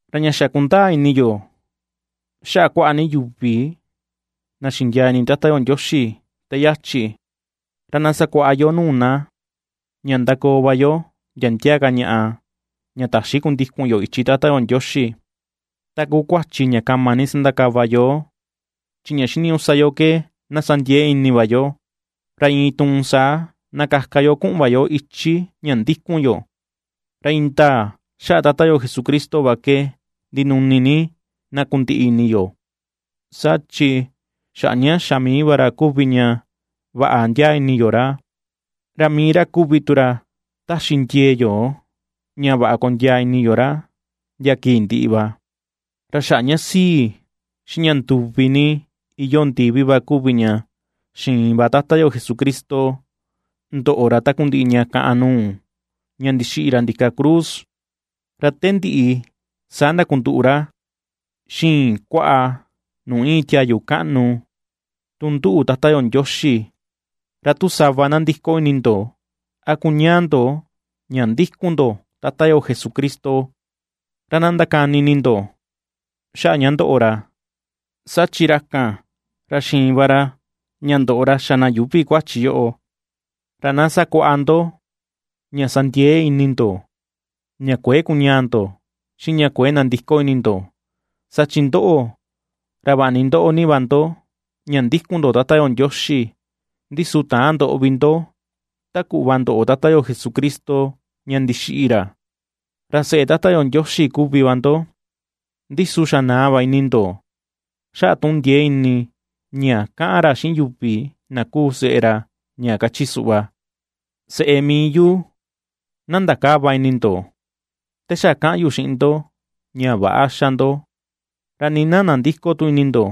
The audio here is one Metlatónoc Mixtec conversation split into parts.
Ra ña xa kundaa ini yo xaꞌa kuaꞌa ni yuvi na xindiaa ini Tata yo Ndioxi te yachi, ra na sakuaꞌa yo nuu na ña ^ndakoo va yo ndia ndia ka ñaꞌa ña ^täxi kundikun yo ichi Tata yo Ndioxi, ta kuu kuachi ña kama ni ^sandakava yoo, chi ña xiniñuꞌu sa yo ke na sa ndiee ini va yo, ra iin tuun saa na kaka yo kuꞌun va yo ichi ña ndikun yo. Ra indaa xaꞌa Tata yo Jesucristo va ke ndinuni ni na kundiꞌi ini yo, saa chi xaꞌa ña xa mii va ra kuvi ña vaꞌa ndiaa ini yo ra, ra mii ra kuvi tu ra taxi ndiee yo ña vaꞌa kondiaa ini yo ra ndia kii ndiꞌi va. Ra xaꞌa ña sii, xiꞌin ña nduvi ni iyoo ndivi va kuvi ña xiin va Tata yo Jesucristo ndoꞌo ra takundiꞌi ña kaꞌan nuu ña ndixiꞌi ra ndika cruz, ra te ndiꞌi saa ndakunduꞌu ra xiꞌin kuaꞌa nuu iin tiayu kaꞌnu nduꞌu Tata yo Ndioxi. Ra tu sava nandiko ini ndo, a kuñaa ndo ña ndikun ndo Tata yo Jesucristo, ra na ^ndakani ini ndo xaꞌa ña ndoꞌo ra, saa chi ra kan ra xiin va ra ña ndoꞌo ra xa na yuuvi kuachi yoꞌo, ra na ^sakuaꞌa ndo ña sa ndiee ini ndo ña kuëe kuñaa ndo, xiꞌin ña kuëe nandiko ini ndo. Saa chi ndoꞌo, ra vaꞌa ni ^ndoꞌo ni va ndo ña ndikun ndo Tata yo Ndioxi, ndi su täan ndoꞌo vi ndo, ta kuꞌva ndoꞌo Tata yo Jesucristo ña ndixiꞌi ra. Ra seꞌe Tata yo Ndioxi kuvi va ndo, ndi su xa naa va ini ndo xaꞌa tuꞌun ndiee ini ña kaꞌan ra xiꞌin yuvi na kuu seꞌe ra, ña kachi ra suꞌva: Seꞌe mii yu, na ndakäva ini ndo, te xa kaꞌan yu xiꞌin ndo ña väꞌa xa ndo, ra nii na nandïko tu ini ndo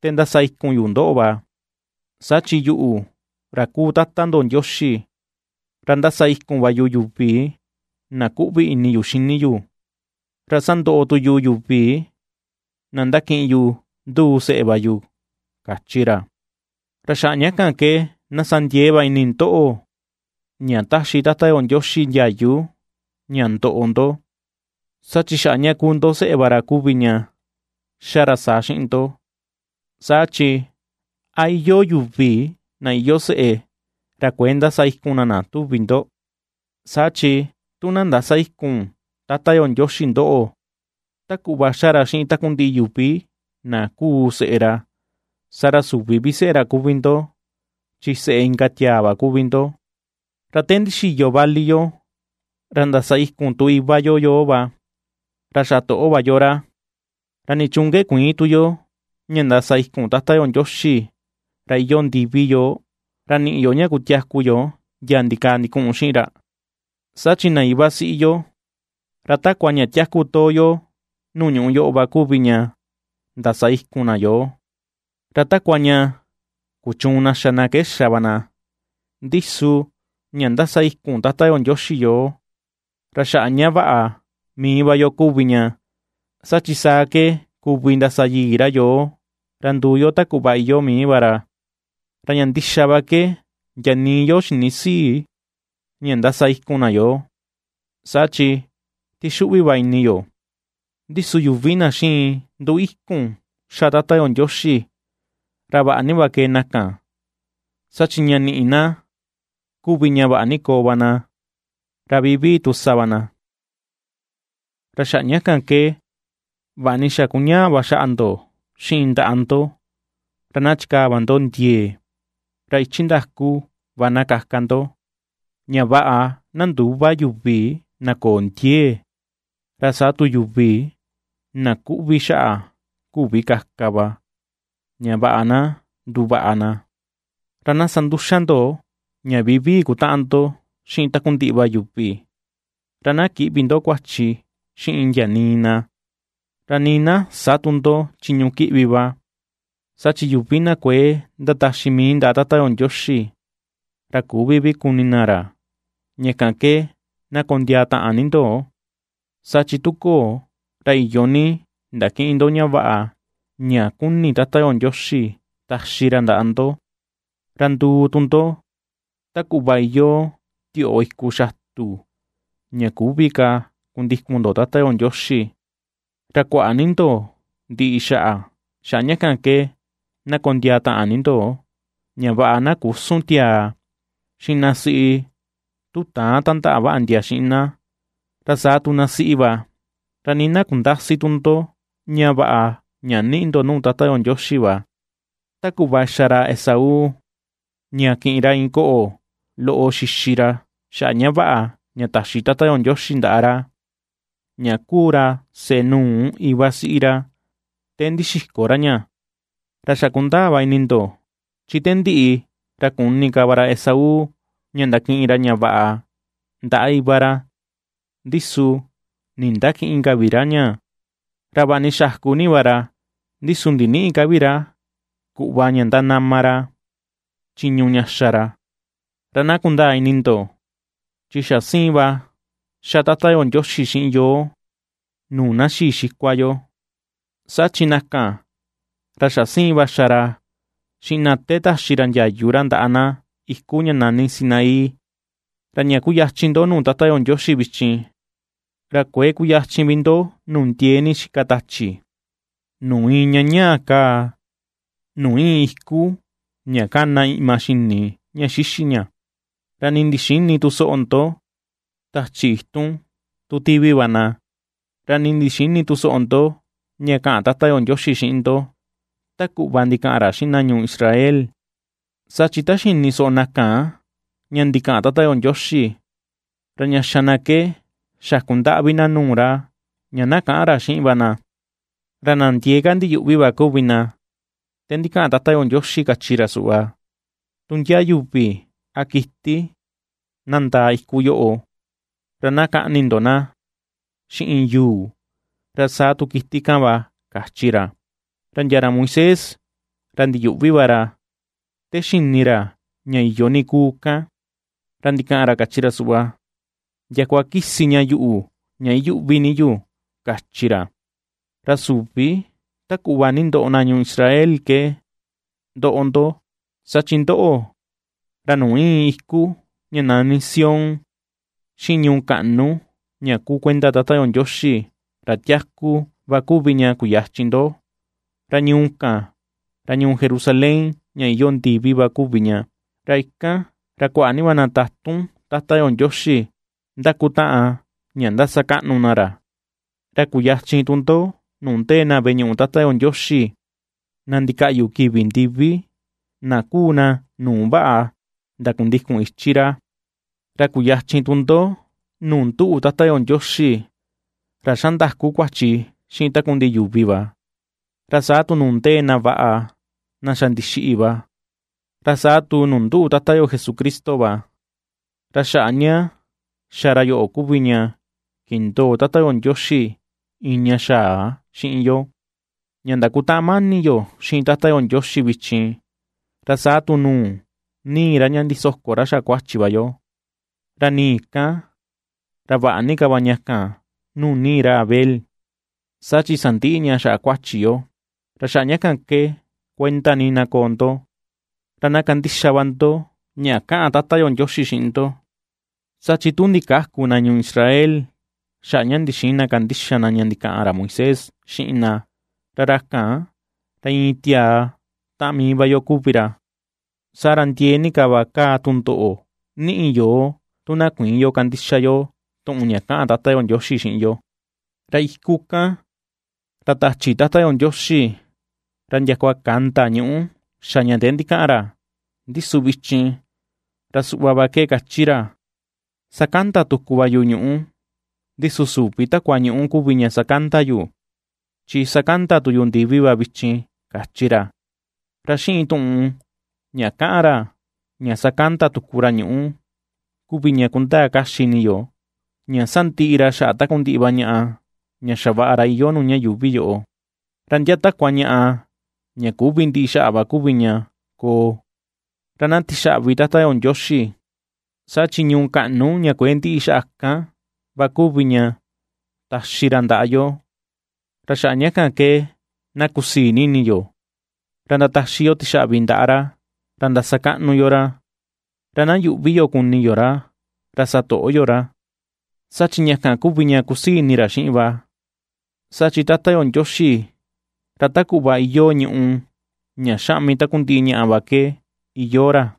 te ndasa ikun yu ndoꞌo va. Saa chi yuꞌu, ra kuu Tata ndo Ndioxi, ra ndasa ikun va yu yuvi na ^kuꞌvi ini yu xini yu, ra sandoꞌo tu yu yuvi na ndakiꞌin yu nduu seꞌe va yu, kachi ra. Ra xaꞌa ña kan ke na sa ndiee va ini ndoꞌo ña taxi Tata yo Ndioxi ndiayu ña ndoꞌo ndo, saa chi xaꞌa ña kuu ndo seꞌe va ra kuvi ña xa ra saa xiꞌin ndo. Saa chi, ¿a iyoo yuvi na iyoo seꞌe, ra kuëe ndasa ikun na na, tuvi ndo? Saa chi tu na ndäsa ikun Tata yo Ndioxi ndoꞌo, ta kuꞌva xa ra xiꞌin takundiꞌi yuvi na kuu seꞌe ra, saa ra süvi vi seꞌe ra kuvi ndo, chi seꞌe inka tiaa va kuvi ndo. Ra te ndixiyo vali yo, ra ndasa ikun tu iva yo yoo va, ra xa toꞌo va yo ra. ¿Ra nichuun ke kuïin tu yo ña ndasa ikun Tata yo Ndioxi ra iyoo ndivi yoo, ra niꞌi yo ña kutiaku yu ndia ndikaa ndikuꞌun xiꞌin ra? Saa chi na iva siꞌi yo, ra takua ña tiaku too yo nuu ñuꞌu yoꞌo va kuvi ña ndasa ikun na yoo, ra takua ña kuchuun na xa na ke xa va na; ndi su ña ^ndasa ikun Tata yo Ndioxi yoo, ra xaꞌa ña vaꞌa mii va yo kuvi ña, saa chi saa ke kuvi ndasa yii ra yoo, ra nduu yo ta kuꞌva iyoo mii va ra. Ra ña ndixa va ke ndia nii yo xinïsii ña ndasa ikun na yoo, saa chi tixuꞌvi va ini yo; ndi su yuvi na xiin nduu ikun xa Tata yo Ndioxi, ra vaꞌa va ^kee na kan, saa chi ña ^niꞌi na kuvi ña vaꞌa ni koo va na, ra vivii tu sa va na. Ra xaꞌa ña kan ke vaꞌa ni xa kuñaa va xaꞌa ndo xiꞌin ndaꞌa ndo, ra na chikaa va ndo ndiee. Ra ichi ndaku va na kaka ndo, ña vaꞌa na ndüva yuvi na köo ndiee, ra saa tu yuvi na kuꞌvi xaꞌa küvi kaka va, ña vaꞌa na nduvaꞌa na. Ra na sa nduxa ndo ña vivii kutaꞌan ndo xiꞌin takundiꞌi va yuvi, ra na kïꞌvi ndo kuachi xiꞌin ndia nii na, ra nii na sä tu ndo chiñu kiꞌvi va, saa chi yuvi na kuëe ndataxi mii ndaꞌa Tata yo Ndioxi, ra küvi vi kuni na ra. Ña kan ke na kondiaa taꞌan ni ndo, saa chi tu köo, ra iyo ni ndakïꞌin ndo ña vaꞌa ña kuni Tata yo Ndioxi taxi ra ndaꞌa ndo; ra nduu tu ndo ta kuꞌva iyoo tioꞌo iku xatu, ra küvi ka kundikun ndo Tata yo Ndioxi, ra kuaꞌa ni ndo ndiꞌi xaꞌa. Xaꞌa ña kan ke na kondiaa taꞌan ni ndo, ña vaꞌa na küsun tiaa xiꞌin na siꞌi tu täan tandaꞌa vaꞌa ndia xiꞌin na, ra saa tu na siꞌi va; ra nii na kundäsi tu ndo ña vaꞌa ña niꞌi ndo nuu Tata yo Ndioxi va; ta kuꞌva xa ra Esaú, ña kiꞌin ra iin koꞌo loꞌo xixi ra xaꞌa vaꞌa ña taxi Tata yo Ndioxi ndaꞌa ra ña kuu ra seꞌe nuu na iva siꞌi ra, te ndixiko ra ña. Ra xa kundaa va ini ndo, chi te ndiꞌi ra kuni ka va ra Esaú ña ndakiꞌin ra ña vaꞌa ndaꞌa iva ra, ndi su nindakïꞌin ka vi ra ña; ra vaꞌa ni xaku ni va ra, ndi su ndinïꞌi ka vi ra kuꞌva ña ndanama ra chiñu ña xa ra. Ra na kundaa ini ndo, chi xa siin va ^xa Tata yo Ndioxi xiꞌin yoo nuu na xii xikua yo, saa chi na kan, ra xa siin va xa ra xiꞌin na te taxi ra ndiayu ra ndaꞌa na iku ña nani Sinaí. Ra ña ^kuyachin ndo nuu Tata yo Ndioxi vichin, ra kuëe kuyachin vi ndo nuu ndiee ni xika tachi, nuu iin ña ñaa kaa, nuu íin iku ña kana iꞌma xini ña xixi ña; ra nii ndixïni tu soꞌo ndo tachi itun tun tivi va na, ra nii ndixïni tu soꞌo ndo ña kaꞌan Tata yo Ndioxi xiꞌin ndo ta kuꞌva ndikaꞌan ra xiꞌin na ñuu Israel. Saa chi ta xini soꞌo na kan ña ndikaꞌan Tata yo Ndioxi, ra ña xa na ke xaku ndaꞌvi na nuu ra ña na käꞌan ra xiꞌin va na. Ra na ndiee ka ndiyuꞌvi va kuvi na te ndikaꞌan Tata yo Ndioxi kachi ra suꞌva: “Tu ndia yuvi a kiti na ndaa iku yoꞌo, ra na kaꞌni ndo na xiꞌin yuu, ra saa tu kiti kan va”, kachi ra. Ra ndia ra Moisés, ra ndiyuꞌvi va ra te xini ra ña iyo ni kuu kan, ra ndikaꞌan ra kachi ra suꞌva: “Ndiakua kisi ña yuꞌu ña iyuꞌvi ni yu”, kachi ra. Ra süvi ta kuꞌva nindoꞌo na ñuu Israel ke ^ndoꞌo ndo, saa chi ndoꞌo, ra nuu íin iku ña nani Sión, xiꞌin ñuu kaꞌnu ña kuu kuenda Tata yo Ndioxi, ra tiaku, va kuvi ña kuyachin ndo; ra ñuu kan, ra ñuu Jerusalén ña iyoo ndivi va kuvi ña; ra ikan, ra kuaꞌa ni na tatun Tata yo Ndioxi ndakutaꞌan ña ^ndasakaꞌnu na ra. Ra kuyachin tu ndo nuu ndee na veꞌe ñuꞌu Tata yo Ndioxi na ndikaꞌyu kivi ndivi, na kuu na nuu vaꞌa ndakundikun ichi ra. Ra kuyachin tu ndo nuu nduꞌu Tata yo Ndioxi, ra ^xa ndaku kuachi xiꞌin takundiꞌi yuvi va, ra saa tu nuu ndee na vaꞌa na xa ndixiꞌi va, ra saa tu nuu nduꞌu Tata yo Jesucristo va. Ra xaꞌa ña xa ra yoꞌo kuvi ña kindoo Tata yo Ndioxi iin ña xaa xiꞌin yo, ña ndakutaꞌan mani yo xiꞌin Tata yo Ndioxi vichin, ra saa tu nuu nii ra ña ndisoko ra xaꞌa kuachi va yo; ra nii kan, ra vaꞌa ni ka va ña kan nuu nii ra Abel, saa chi sandiꞌi ña xaꞌa kuachi yo. Ra xaꞌa ña kan ke kuenda ni na koo ndo, ra na kandixa va ndo ña kaꞌan Tata yo Ndioxi xiꞌin ndo. Saa chi tu ndikäku na ñuu Israel xaꞌa ña ndixïin na kandixa na ña ndikaꞌan ra Moisés xiꞌin na, ra ra kan ra iin tiaa taꞌan mii va yo kuvi ra, saa ra ndiee ni ka va kaa tundoꞌo niꞌi yoo tu na kuïin yo kandixa yo tuꞌun ña kaꞌan Tata yo Ndioxi xiꞌin yo. Ra iku kan, ra tachi Tata yo Ndioxi, ra ndiakua kanda ñuꞌu xa ña te ndikaꞌan ra; ndi su vichin, ra suꞌva va ke kachi ra: “Sakanda tuku va yu ñuꞌu, ndi su süvi takua ñuꞌu kuvi ña sakanda yu, chi sakanda tu yu ndivi va vichin”, ^kachi ra. Ra xiꞌin tuꞌun ña kaꞌan ra “ña sakanda tuku ra ñuꞌu”, kuvi ña kundaa kaxi ini yo, ña sandiꞌi ra xaꞌa takundiꞌi va ñaꞌa ña xavaꞌa ra iyoo nuu ña yuuvi yoꞌo, ra ndia takua ñaꞌa ña küvi ndiꞌi xaꞌa va kuvi ña koo. Ra na tixaꞌvi Tata yo Ndioxi, saa chi ñuu kaꞌnu ña kuëe ndiꞌi xaꞌa kan va kuvi ña taxi ra ndaꞌa yo; ra xaꞌa ña kan ke na kusii ni ini yo, ra ndataxi yo tixaꞌvi ndaꞌa ra, ra ndasakaꞌnu yo ra, ra na yuꞌvi yo kuni yo ra, ra satoꞌo yo ra; saa chi ña kan kuvi ña kusii ini ra xiꞌin va, saa chi Tata yo Ndioxi ra ta kuꞌva iyoo ñùꞌù ña xaꞌmi takundiꞌi ña va ke iyoo ra.